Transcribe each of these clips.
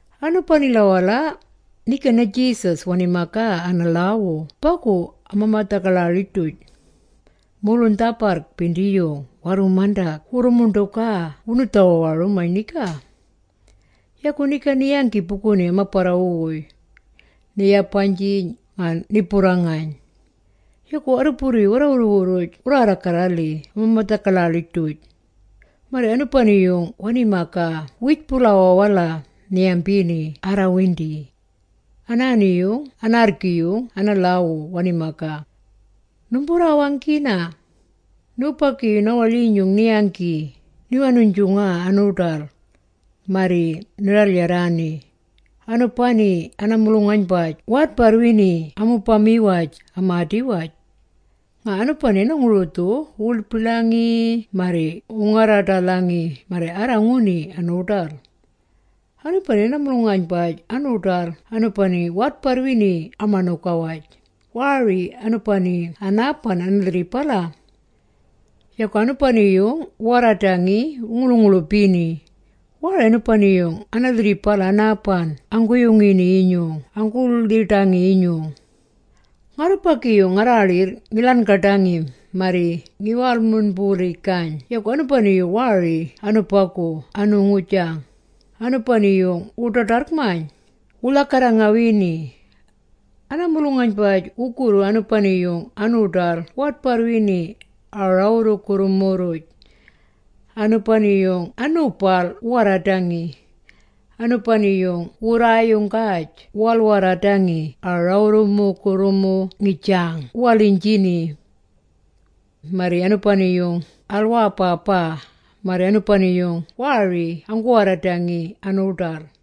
Anubanila-wala, niga na-Jesus wani-magaa ana-lhaawu bagu ama-madha-gaḻaḻij-duj. Mulung-dhabarrj-bindiyung warru-mandag wurru-muṉḏugaa wunu-dhawawarumayn niga, yagu niga ni-yanggi buguni ama-barrawu-wuy, ni-yabaynjiyn nga ni-burrangayn. Yagu warruburru-yung warra-wurru-wurruj wurraarra-garra-lhi ama-madha-gaḻaḻij-duj. Marri anubani-yung wani-magaa wiij-bulawaa-wala, ni-yambini arrawindi. Anaani-yung anaarrgi-yung ana-lhaawu wani-magaa. “Numburraawanggina! Nubagi-yung na-waḻyinyung ni-yanggi, ni-wanuynjungaa anu-ḏal. Marri ni-ral-yarraani. Anubani ana-mulung-aynbaj waadbarrwini amubama-waj amaadi-waj. Nga anubani ana-ngurudhu wu-wilbilangi marri wu-ngarra-ḏalhangi marri arra-nguni anu-ḏal. “Anubani ana-mulung-aynbaj anu-ḏal anubani waadbarrwini ama-ṉuga-waj, waari anubagu anaaban ana-lhirribala. Yagu anubani-yung waarradangi wu-nguḻu-nguḻubini, waari anubagu ana-lhirribala anaaban anuguni-yinyung anggu-lhiḏangi-yinyung. Ngarrubagi-yung ngarraaḻirr ngi-ḻan.gaḏangi marri ngi-wal-murrmbulingijgayn yagu anubani-yung waari anubagu anu-ngujang, anubani-yung wu-ḏaḏarrg-mayn, wu-lhagarra-ngawini. “Ana-mulung-aynbaj wugurru anubani-yung anu-ḏal waadbarrwini a-rawurrumugurrumu-rruj. Anubani-yung anu-bal waarradangi. Anubani wugurraayunggaj wu-wal-warradangi ana-rawurrumugurrumu ngijang wu-waliynjini. Marri anubani-yung al-waabaabaa, marri anubani-yung waari anggu-warradangi anu-ḏal.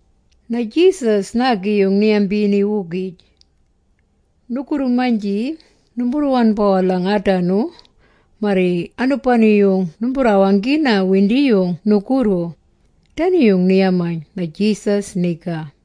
Na-Jesus naagi-yung ni-yambini-wugij. “Nugurru-maynji numburraan-bawalhang aadanu, marri anubani-yung numburraawanggina windiyung nugurru!” Dani-yung ni-yamaa na-Jesus niga.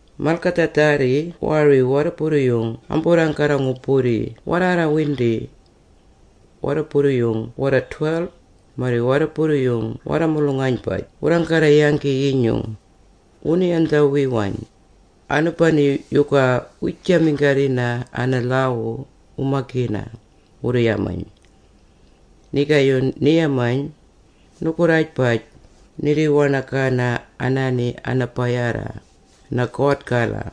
Malgadhaadharri waari warruburru-yung amburraanggarra-ngu-burri warraarraarrawindi. Warruburru-yung warra-12, marri warruburru-yung warra-mulung-aynbaj wurraanggarra-yanggi-yinyung, wunu-yandhawiwayn, “Anubani yuga wiijaminggarrina ana-lhaawu, wu-magina?” wurru-yamayn. Nigaayung ni-yamayn, “Nugurraajbaj, nirri-waṉagana anaani ana-bayarra, na-God-gala.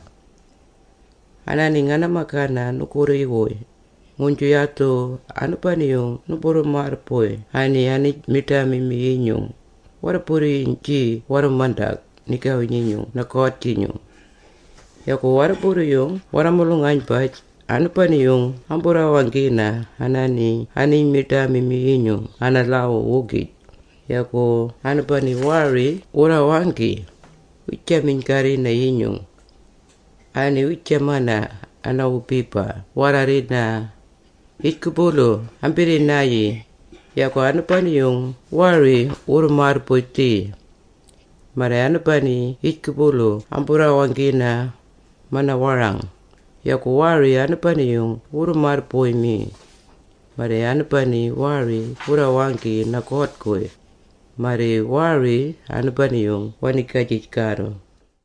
Anaani ngana-magana nugurri-wuy, nguynju yadhu anubani-yung numburru-marrbuy anubani aniij-miḏaamimi-yinyung, warruburru-yung-jinyung warru-mandag nigawi-nyinyung na-God-jinyung. Yagu warruburru-yung warra-mulung-aynbaj anubani-yung amburraawanggina anaani-yung aniij-miḏaamimi-yinyung ana-lhaawu-wugij, yagu anubani waari wurraawanggi, wiijaminggarrina-yinyung. Anaani wiijamana, ana-wubiba waarrarrina, ‘Yijgubulu ambirriij-nayii, yagu anubani-yung waari wurru-marrbuy-dhi. Marri anubani yijgubulu amburraawanggina, manaama mana-warang, yagu waari anubani-yung wurru-marrbuy-mi. Marri anubani waari wurraagi na-God-guy, marri waari anubani-yung waniigajij-garru.’”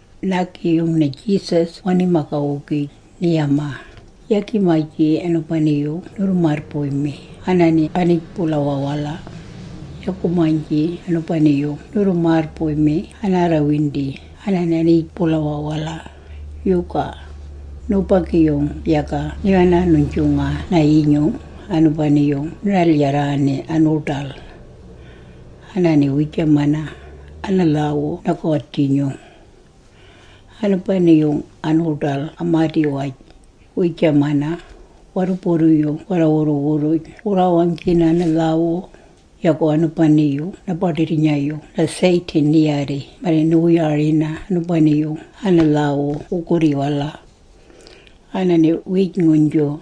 Naagi-yung na-Jesus wani-magaa-wugij, ni-yamaa, “Yagi-maynji anubani-yung nurru-marrbuy-mi anaani aniij-bulawaa-wala, yagu-maynji anubani-yung nurru-marrbuy-mi anaarrawindi anaani aniij-bulawaa-wala, yuga? Nubagi-yung yaga ni-wanuynjungana-yinyung, anubani-yung ni-ral-yarraani anu-ḏal. Anaani wiijamana, ana-lhaawu na-God-inyung. “Anubani-yung anu-ḏal amaadi-waj, wiijamana, warruburru-yung warra-wurru-wurruj wurraawanggina ana-lhaawu, yagu anubani-yung na-baḏirrnya-yung na-Satan ni-yaarri marri niwu-yarina anubani-yung ana-lhaawu wugurri-wala. Anaani wiij-nguynju,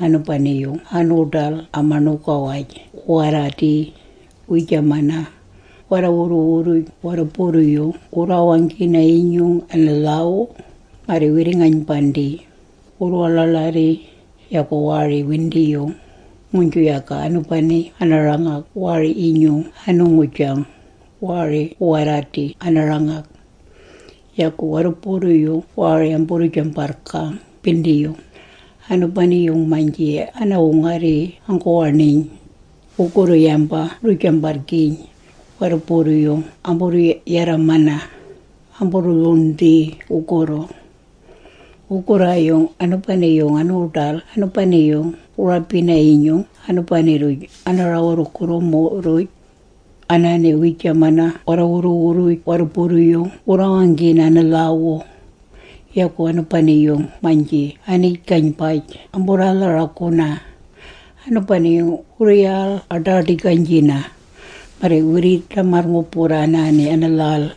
anubani-yung anu-ḏal ama-ṉuga-waj waarradii, wiijamana, warra-wurru-wurruj warruburru-yung wurru-wawanggina-yinyung ana-lhaawu, marri wirri-ngaynbandii, wurru-waḻaaḻarrii, yagu waari-windiyung, nguynju yaga anubani ana-rangag waari-yinyung anu-ngujang, waari wu-warradi ana-rangag. Yagu warruburru-yung waari amburru-jambarrgang-bindiyung, Anubani-yung-maynji ana-wungarri anggu-waṉiyn, wugurru yamba wurru-jambarrgiiyn, warruburru-yung amburru-yarramana, amburru-lhuṉdhii wugurru. “Wugurraayung anubani-yung anu-ḏal anubani-yung wu-rabina-yinyung anubani-rruj ana-rawurrumugurrumu-rruj, anaani wiijamana warra-wurru-wurruj warruburru-yung wurru-wawanggina ana-lhaawu, yagu anubani-yung-maynji aniij-gaynbaj amburraalharaguna, anubani-yung wurru-yaal-aḏaaḏigaynjina. Marri wirrii-ḏamarr-ngu-burraa anaani ana-lhal,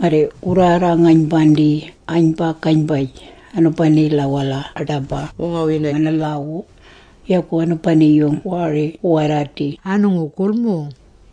marri wurraarra-ngaynbandii aynba-gaynbaj. Anubanila-wala aḏaba wu-ngarina ana-lhaawu. Yagu anubani-yung waari wu-warradi anu-ngugulumung.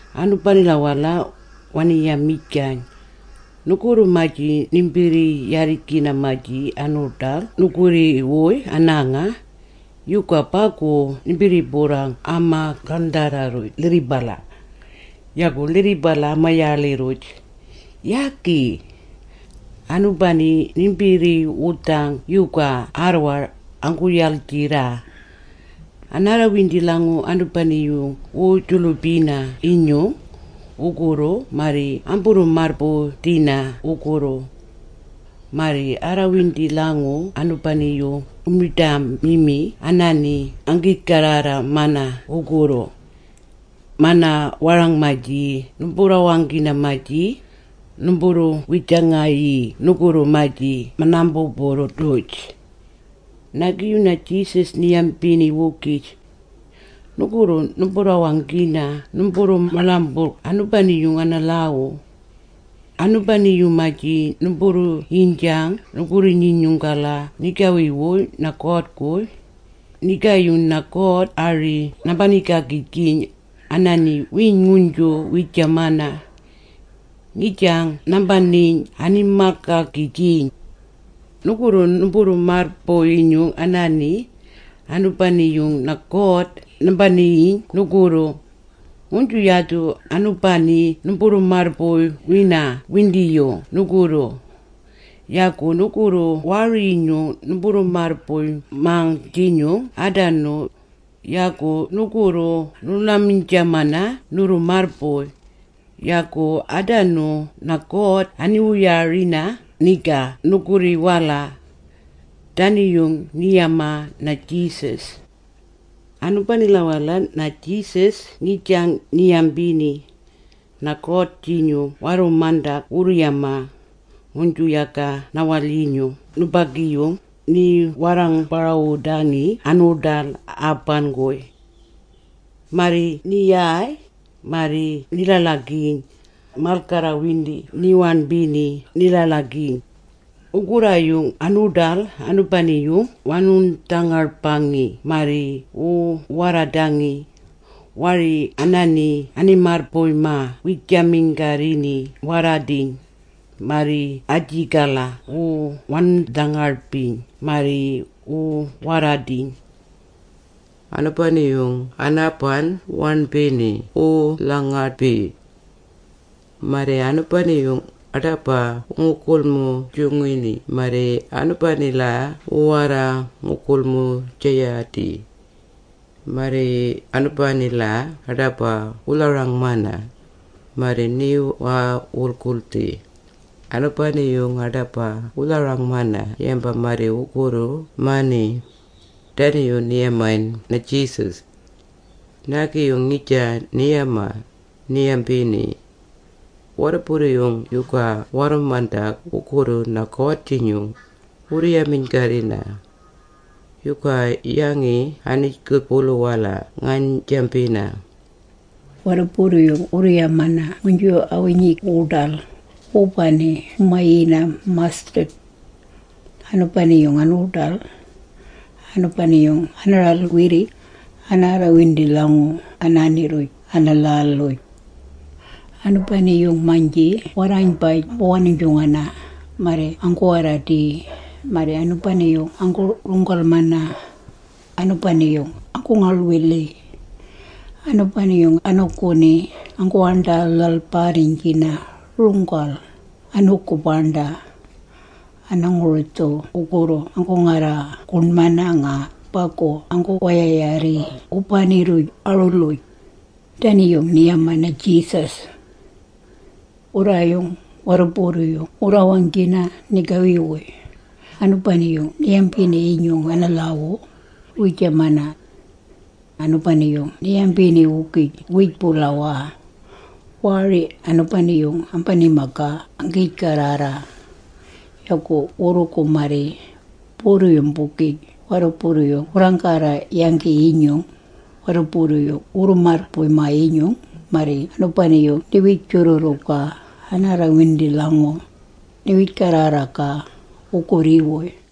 Anubanila-wala, wani-yamijgayn, “Nugurru-maynji nimbirri-yarrijgina-maynji anu-dhalng nugurri-wuy anaanga, yuga bagu nimbirri-burrang ama-gaṉdharra-rruj lhirribala? Yagu lhirribala ama-yaaḻi-rruj? Yagi! Anubani nimbirri-wudhang yuwaagu arrwar, anggu-yaljirraa. Anaarrawindi-lhangu anubani-yung wu-julubina-yinyung, wurrugu marri amburru-marrbuy-dhina wugurru. Marri anaarrawindi-lhangu anubani-yung wu-miḏaamimi anaani anggiij-garrarra-mang wugurru. Mana-warang-maynji numburraawanggina-maynji, numburru-wijangayii nugurri-rruj aambubug-duj.” Naagi-yung na-Jesus ni-yambini-wugij. “Nugurru numburraawanggina numburru-maaḻamburrg anubani-yung ana-lhaawu. Anubani-yung-maynji numburru-yiynjang nugurri-nyinyung-gala nigawi-wuy na-God-guy, nigaayung na-God ari nambanii-gaagijgiyn, anaani wiij-nguynju wiijamana. Ngijang nambaniiyn ani-malgaagijgiyn. Nugurru numburru-marrbuy-yinyung anaani, anubani-yung God nambaniiyii nugurru, nguynju yadhu anubani numburru-marrbuy-wina windiyung nugurru. Yagu nugurru waari-yinyung numburru-marrbuy-mang-jinyung aadanu, yagu nugurru nurraaḻamin-jamana nurru-marrbuy, yagu aadanu na-God aniwu-yarina niga nugurri-wala.” Dani-yung ni-yamaa na-Jesus. Anubanila-wala na-Jesus ngijang ni-yambini, “Na-God-jinyung warru-mandag wu-yamana, nguynju yaga na-waḻyinyung nubagi-yung ni-warra-ngu-barawudangi anu-ḏal aaban-guy. Marri ni-yaay, marri ni-ḻaḻagiiyn, malgarrawindi ni-waṉbini ni-ḻaḻagini. Wugurraayung anu-ḏal anubani-yung wu-wanung-dhangaḏbangi marri wu-warradangi. Waari anaani ani-marrbuy-magaa wiijaminggarrina wu-warradii, marri ajigala wu-wanung-dhangaḏbii marri wu-warradii. Anubani-yung anaaban waaṉbina wu-wal-lhangaḏbii. Marri anubani-yung aḏaba wu-gulmung-jungina marri anubanila wu-warra-ngugulmung-jayaadii. Marri anubanila aḏaba wu-lharang-mana. Marri ni-wal-wulguldhii. Anubani-yung aḏaba wu-lharang-mana yamba marri ngurru-mani.” Dani-yung ni-yamayn na-Jesus. Naagi-yung ngijang ni-yamaa, ni-yambini. “Warruburru-yung yuga warru-mandag wugurru na-God-jinyung, wurru-yaminggarrina? Yuga yangi aniij-bulawaa-wala ngaynjambina? Warruburru-yung wurru-yamana nguynju a-winyig wuḏal, wubani wu-mayini mustard. Anubani-yung anu-ḏal, anubani-yung ana-ral-wirrig, anaarrawindi-lhangu anaani-rruj ana-lhal-uj. Anubani-yung-maynji warraaynbaj ambu-wanuynjungana, marri anggu-warradii, marri anubani anggu-runggal-mana, anubani-yung anggu-ngaḻ-wilii. Anubani-yung anuuguni anggu-waṉḏa-lhalbarriynjina runggal, anu-gubaṉḏa. Ana-ngurudhu wugurru anggu-ngarra-guṉmana nga bagu anggu-wayayarrii wubani-rruj a-ruluj.” Dani-yung ni-yamaa na-Jesus. Wugurraayung warruburru-yung wurraawanggini nigawi-wuy, anubani-yung ni-yambini-yinyung ana-lhaawu, wiijamaa. Anubani-yung ni-yambini-wugij wiij-bulawaa-wala. Waari anubani-yung ambani-magaa anggiij-garrarra. Yagu wurrugu marri, burru-yung-bugij warruburru-yung wurraanggarra-yanggi-yinyung, warruburru-yung wurru-marrbuy-maa-yinyung, marri anubani-yung ni-wij-jurrurrugaa anaarrawindi-lhangu, ni-wij-garrarra-gaa, wugurri-wuy.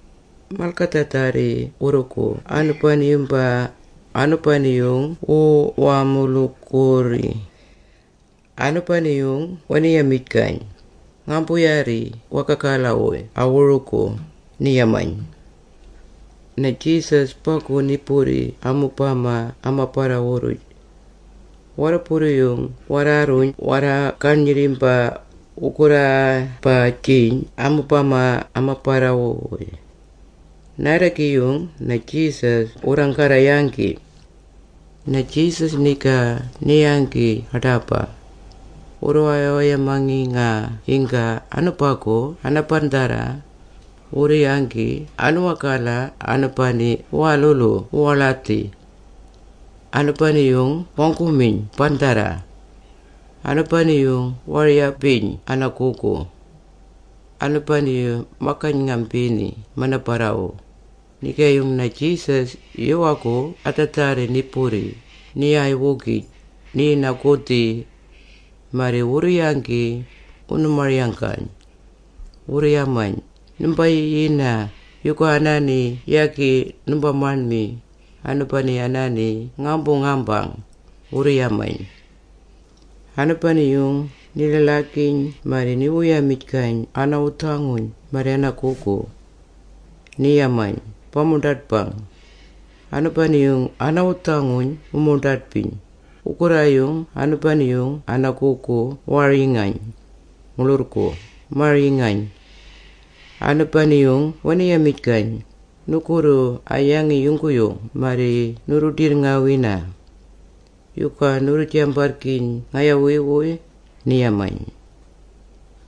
Malgadhaadharri wurrugu anubani-yumbaa, anubani-yung wu-wamulugugurri. Anubani-yung wani-yamijgayn, “Ngaambu-yaarri wagagala-wuy a-wurugu,” ni-yamayn. Na-Jesus bagu ni-burri amubama ama-barrawu-rruj. Warruburru-yung warraarruyn warra-garnyirrimba, wuu-ngarra-jabaynjiyn amubama ama-barrawu-wuy. Naadagi-yung na-Jesus wurraanggarra-yanggi. Na-Jesus niga ni-yingayn aḏaba. Wurru-waya-wayamangi… nga yingga anubagu ana-bandharra. Wu-yanggi anuwaagala anubani wuwalulu wu-waḻadhi. Anubani-yung wanggu-miyn bandharra. Anubani-yung waar-yabaynjini anaa-gugu. Anubani-yung ma-gayn-ngambini mana-barrawu. Nigaayung na-Jesus yuwaagu adhaadharri ni-burri, ni-yaay-wugij, ni-yinag-gudhi. Marri wurru-yanggi, wunu-marayanggayn. Wurru-yamayn, “Nimba-yiyina-yinyung, yuga anaani yagi nimba-maṉmi, anubani anaani ngaambu-ngambang!” wurru-yamayn. Anubani-yung ni-ḻaḻagiiyn marri niwu-yamijgayn ana-wudhanguyn marri anaa-gugu. Ni-yamayn, “Ba-muḏaḏbang!” Anubani-yung ana-wudhanguyn wu-muḏaḏbiyn, wugurraayung anubani-yung anaa-gugu waar-yingayn, muḻurrgu maar-yingayn. Anubani-yung wani-yamijgayn, “Nugurru a-yangi yungguyung marri nurru-ḏirrngawina? Yuga nurru-jambarrgiiyn ngayawi-wuy?” ni-yamayn.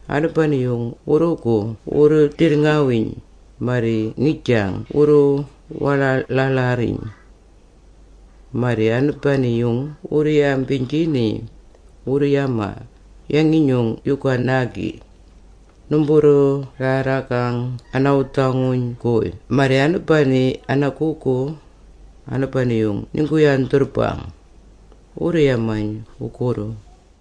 Anubani-yung wurrugu wurru-ḏirrngawiiyn, marri ngijang wurru-waḻaaḻarriyn. Marri anubani-yung wurru-yambiynjini, wurru-yamaa, “Yangi-nyung yuga naagi? Numburraarranggang a-wudhanguyn-guy marri anubani aa-gugu! Anubani-yung ninggu-warra-yandhurrbang!” wurru-yamayn wugurru.